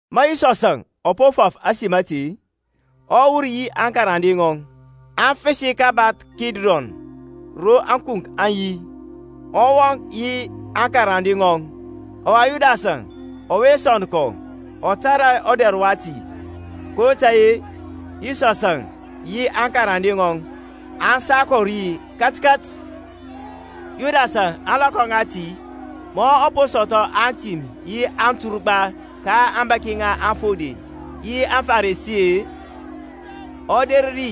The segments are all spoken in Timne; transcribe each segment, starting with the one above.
Ma Yisɔsȧŋ ɔ po fɔf ȧsim ȧte-e, ɔ wur yi aŋkarande ŋɔŋ, aŋ fəsi kabath Kidrɔn ro ȧkunk aŋ yi, ɔ wɔŋ ri yi aŋkarande ŋɔŋ. Ɔwa Yudasȧŋ ɔwe sɔnd kɔ, ɔ tȧrȧ ɔdɛr wati, kotȧy-e Yisɔsȧŋ yi aŋkarande ŋɔŋ aŋ sa kɔ ri katkat. Yudasȧŋ ȧŋlɔkɔ ŋati, ma ɔ po sɔthɔ atim yi aturgba ka aŋbȧki ŋa aŋfode yi aŋFarisi-e, ɔ der ri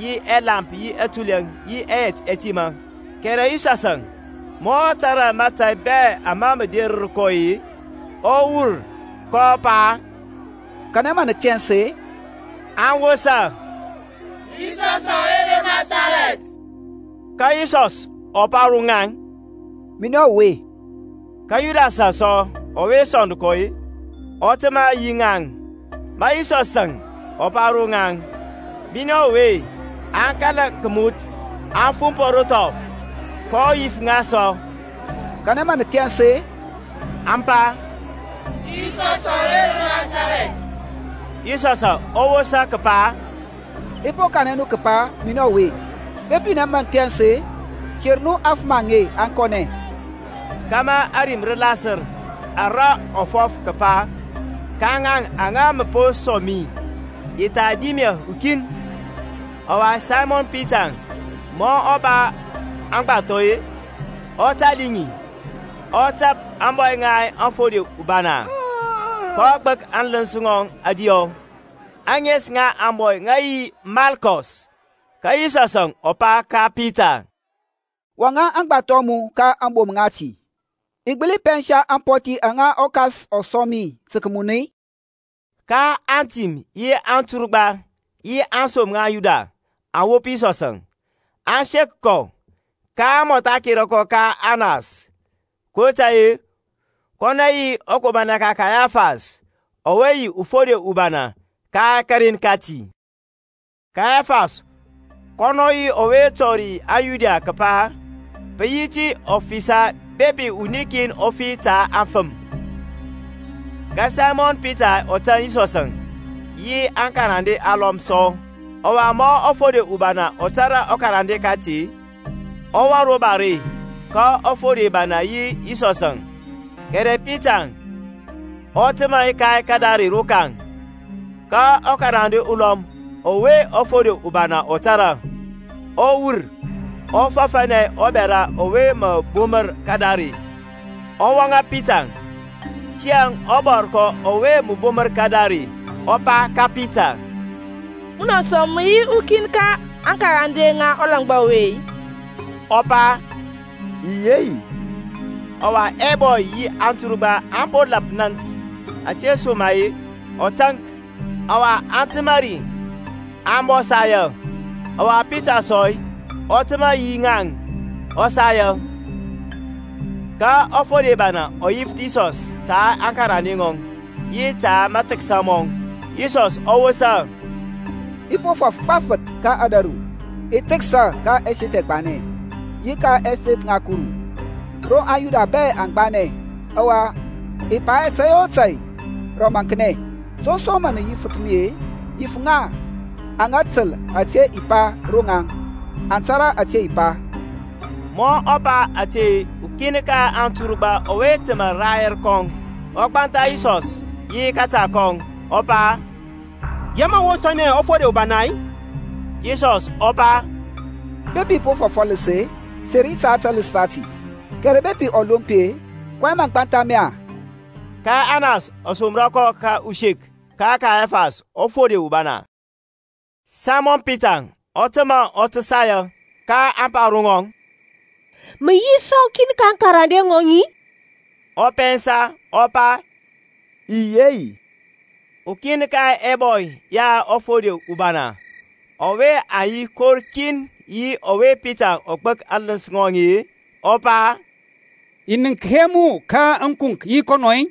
yi ɛlamp yi tulɛ yi ɛyɛt ɛtimȧ. Kɛrɛ Yisɔsȧŋ ma ɔ tȧrȧ mȧtȧy bɛ ama mə derər kɔ-e, ɔ wur, kɔ pa, Kanɛ mə nə thɛns-e? Aŋ wosa, Yisɔsȧŋ ɔwe ro Nasarɛth. Ka Yisɔs ɔ pa ro ŋaŋ. Minɛ ɔwe. Ka Yudasȧŋ sɔ ɔwe sɔnd kɔ-e, ɔ təmȧ yi ŋaŋ. Ma Yisɔsȧŋ ɔ pa ro ŋaŋ, Minɛ ɔwe, aŋ kala kəmuth, aŋ fumpɔ ro thɔf. kɔ yif ŋa sɔ, Kanɛ mə nə thɛns-e? Aŋ pa, Yisɔsȧŋ ɔwe ro Nasarɛth. Yisɔsȧŋ ɔ wosa kəpa, I po kanɛ nu kəpa minɛ ɔwe: bepi minɛ mə nə thɛns-e, ter nu aŋfəm aŋe aŋ kɔnɛ: kȧmȧ ȧrim rə lasər ara ɔ fɔf kəpa, Ka ŋaŋ aŋa mə po sɔŋ mi i tha dim hɛ ukin. Ɔwa Saymɔn Pitaŋ ma ɔ ba agbathɔ-e, ɔ tali ŋi, ɔ tap ȧŋbɔy ŋa ɔfode ubana, kɔ gbək aŋləns ŋɔŋ ȧdiyɔ. Aŋes ŋa ȧŋbɔy ŋə yi Malkɔs. Ka Yisɔsȧŋ pa ka Pita, Wɔŋȧ aŋgbathɔ a mu ka aŋbom ŋati. I gbəli pɛnsa ampɔthi aŋa ɔKas ɔ sɔŋ mi tə kəmun-i? Ka antim yi anturgba, yi aŋsom ŋa aŋYuda aŋ wop Yisɔsȧŋ, aŋ sek kɔ, kaŋ mɔtha kera kɔ ka Anas; kotȧy-e kɔnɔ yi ɔkomanɛ ka Kayafas, ɔwe yi ɔfode ubana ka karen kati. Kayafas kɔnɔ yi ɔwe tɔri aŋYuda kəpa, pə tə yi ɔfisa bepi wuni kin ɔ fi ta aŋfəm. Ka Saymɔn Pitaŋ ɔ tȧŋ Yisɔsȧŋ, yi ukarande ulɔm sɔ. Ɔwa ma ɔfode ubana ɔ tȧrȧ ɔkarande kati, ɔ wɔŋ ro bare ka ɔfode ubana yi Yisɔsȧŋ; kɛrɛ Pita ɔ təmȧ ka kadare rokaŋ. Ka ɔkarande ulɔm ɔwe ɔfode ubana ɔ tȧrȧ, ɔ wur, ɔ fɔfȧnɛ ɔbɛra ɔwe mə bumər kadare, ɔ wɔŋȧ Pitaŋ. Tiyȧŋ ɔbɔrkɔ ɔwe mə bumər kadare ɔ pa ka Pita, Munɔ sɔ mə yi ukin ka aŋkarande ŋa ɔlangba ɔwe-i? Ɔ pa, I yi hɛ yi. Ɔwa ɛbɔy yi anturgba aŋ po lap nȧnt; ȧtesoma-e ɔ taŋk: ɔwa aŋ təmȧ ri aŋ bɔ saya: ɔwa Pita sɔ ɔ təmȧ yi ŋaŋ, ɔ saya. Ka ɔfode ubana ɔ yifəth Yisɔs ta aŋkarande ŋɔŋ, yi ta mathəksa mɔŋ. Yisɔsȧŋ ɔ wosa, I po fɔf gbafəth ka ȧdȧru: i thəksa ka ɛseth ɛgbanɛ, yi ka ȧŋseth ŋa Kuru, ro aŋYuda bɛ aŋ gbanɛ, ɔwa i pa hɛ tȧy o tȧy rə ɔmaŋknɛ. To som mȧ mə yifəth mi-e? Yif ŋa aŋa təl ȧte i pa ro ŋaŋ: aŋ tȧrȧ ȧte i pa. Ma ɔ pa ȧte ukin ka anturgba ɔwe təmȧ rayɛr kɔŋ ɔ gbantha Yisɔs yi kȧta kɔŋ, ɔ pa, Yaŋ mȧ mə wosȧnɛ ɔfode ubana-i? Yisɔs ɔ pa, Bepi i po fɔf ɔləs-e, seri ta taləs tati, kɛrɛ bepi ɔlompi-e, kɔyɛŋ mȧ gbantha mi-a? Ka Anas ɔ somrȧ kɔ usek ka Kayafas ɔfode ubana. Saymɔn Pitaŋ ɔ təmȧ ɔ tə saya. Kaŋ pa ro ŋɔŋ, Mə yi sɔ ukin ka aŋkarande ŋɔŋ-i? Ɔ pɛnsa, ɔ pa, I yi hɛ yi. Ukin ka ɛbɔy ya ɔfode ubana, ɔwe aŋ yi kor kin yi ɔwe Pita ɔ gbək aŋləns ŋɔŋ-e, ɔ pa, I nənk hɛ mu ka ȧŋkunk yi kɔnɔŋ-i?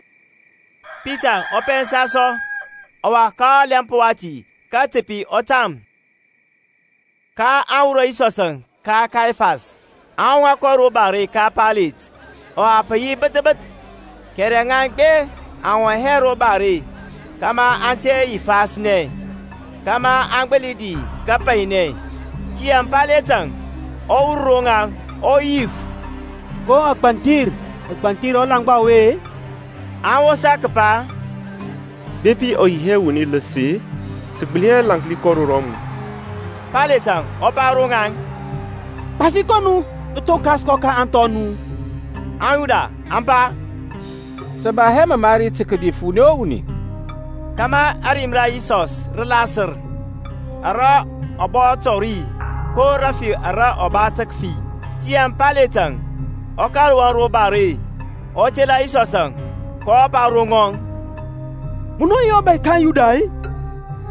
Pitaŋ ɔ pɛnsa sɔ; ɔwa ka ɔlɛmp wati katəpi ɔ tam. kaŋ wurɔ Yisɔsȧŋ ka Kayafas, aŋ wɔŋȧ kɔ ro bare ka Paylet: ɔwa pə yi bəth bəth; kɛrɛ ŋaŋ gbeŋ aŋ wɔŋ hɛ ro bare, kȧmȧ aŋ te yifasnɛ, kȧmȧ aŋ gbəli di kapainɛ. Tiyȧŋ Payletȧŋ ɔ wur ro ŋaŋ, ɔ yif, Ko agbanthir nə gbanthir ɔlaŋgba ɔwe-e? Aŋ wosa kəpa, Bepi ɔ yi hɛ wuni ləs-e, sə gbəli hɛ lȧnki kɔ ro mu. Payletȧŋ ɔ pa ro ŋaŋ, Gbasi kɔ nu, nə thonkas kɔ ka ȧŋthɔ a nu. AŋYuda aŋ pa, Sə ba hɛ məmari tə kədif wuni o wuni: kȧmȧ ȧrim ra Yisɔs rə lasər, ara ɔ pa kətɔri ko rəfi ara ɔ ba tə kəfi. Tiyȧŋ Payletȧŋ ɔ kȧl wɔŋ ro bare, ɔ tela Yisɔsȧŋ, kɔ pa ro ŋɔŋ, Munɔ yi ɔBȧy ka aŋYuda-i?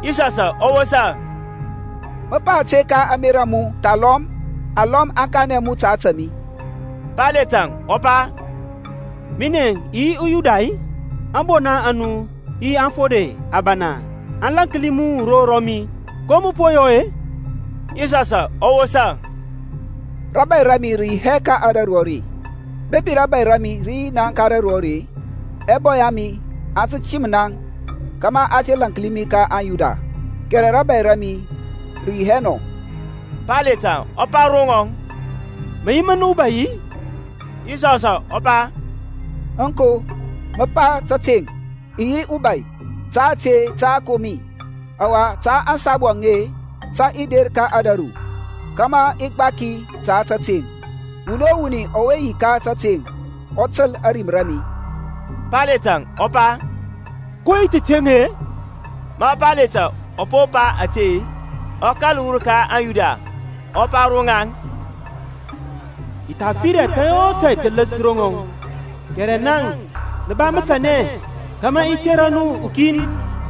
Yisɔsȧŋ ɔ wɔsa, Mə pa ȧte ka ȧŋmerȧ a mu, thalɔm alɔm aŋ kanɛ mu ta ȧtȧ mi-i? Payletȧŋ ɔ pa, Minɛŋ i yi uYuda-i? Aŋbona a mu yi aŋfode abana aŋ lȧnki mu ro rɔmi; ko mə po yɔ-e? Yisɔsȧŋ ɔ wosa, Rȧbȧy ra mi rə yi hɛ ka ȧdȧru are: bepi rȧbȧy ra mi rə yi ka ȧdȧru are, ɛbɔy ɛ mi aŋ tə tim naŋ kȧmȧ a te lȧnki mi ka aŋYuda: kɛrɛ rȧbȧy ra mi rə yi hɛ nɔ. Payletȧŋ pa ro ŋɔŋ, Mə yi mən ubai-i? Yisɔsȧŋ ɔ pa Aŋko, mə pa tȧteŋ, i yi ubȧy. Ta ȧte tə a kom mi, ɔwa ta ȧŋsabu aŋe tə i der ka ȧdȧru, kȧmȧ i gbaki ta tȧteŋ. Wuni o wuni ɔwe yi ka tȧteŋ ɔ təl ȧrim ra mi. Payletȧŋ ɔ pa, Ko yi tateŋ-e? Ma Payletȧŋ ɔ po pa ȧte, ɔ kȧl wur ka aŋYuda, ɔ pa ro ŋaŋ, I tha fir hɛ tȧy o tȧy tələs ro ŋɔŋ. Kɛrɛ naŋ nə ba mətanɛ, kȧmȧ i tera nu wuni kin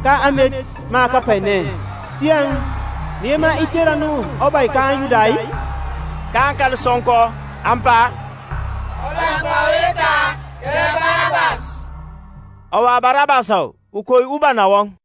ka amet ma kapainɛ; tiyȧŋ nə yema i tera nu ɔBȧy ka aŋYuda-i? kaŋ kȧl sɔŋkɔ, aŋ pa, Ɔlaŋgba ɔwe thahɔ, kɛrɛ Barabas. Ɔwa Barabas ukei ubana wɔŋ.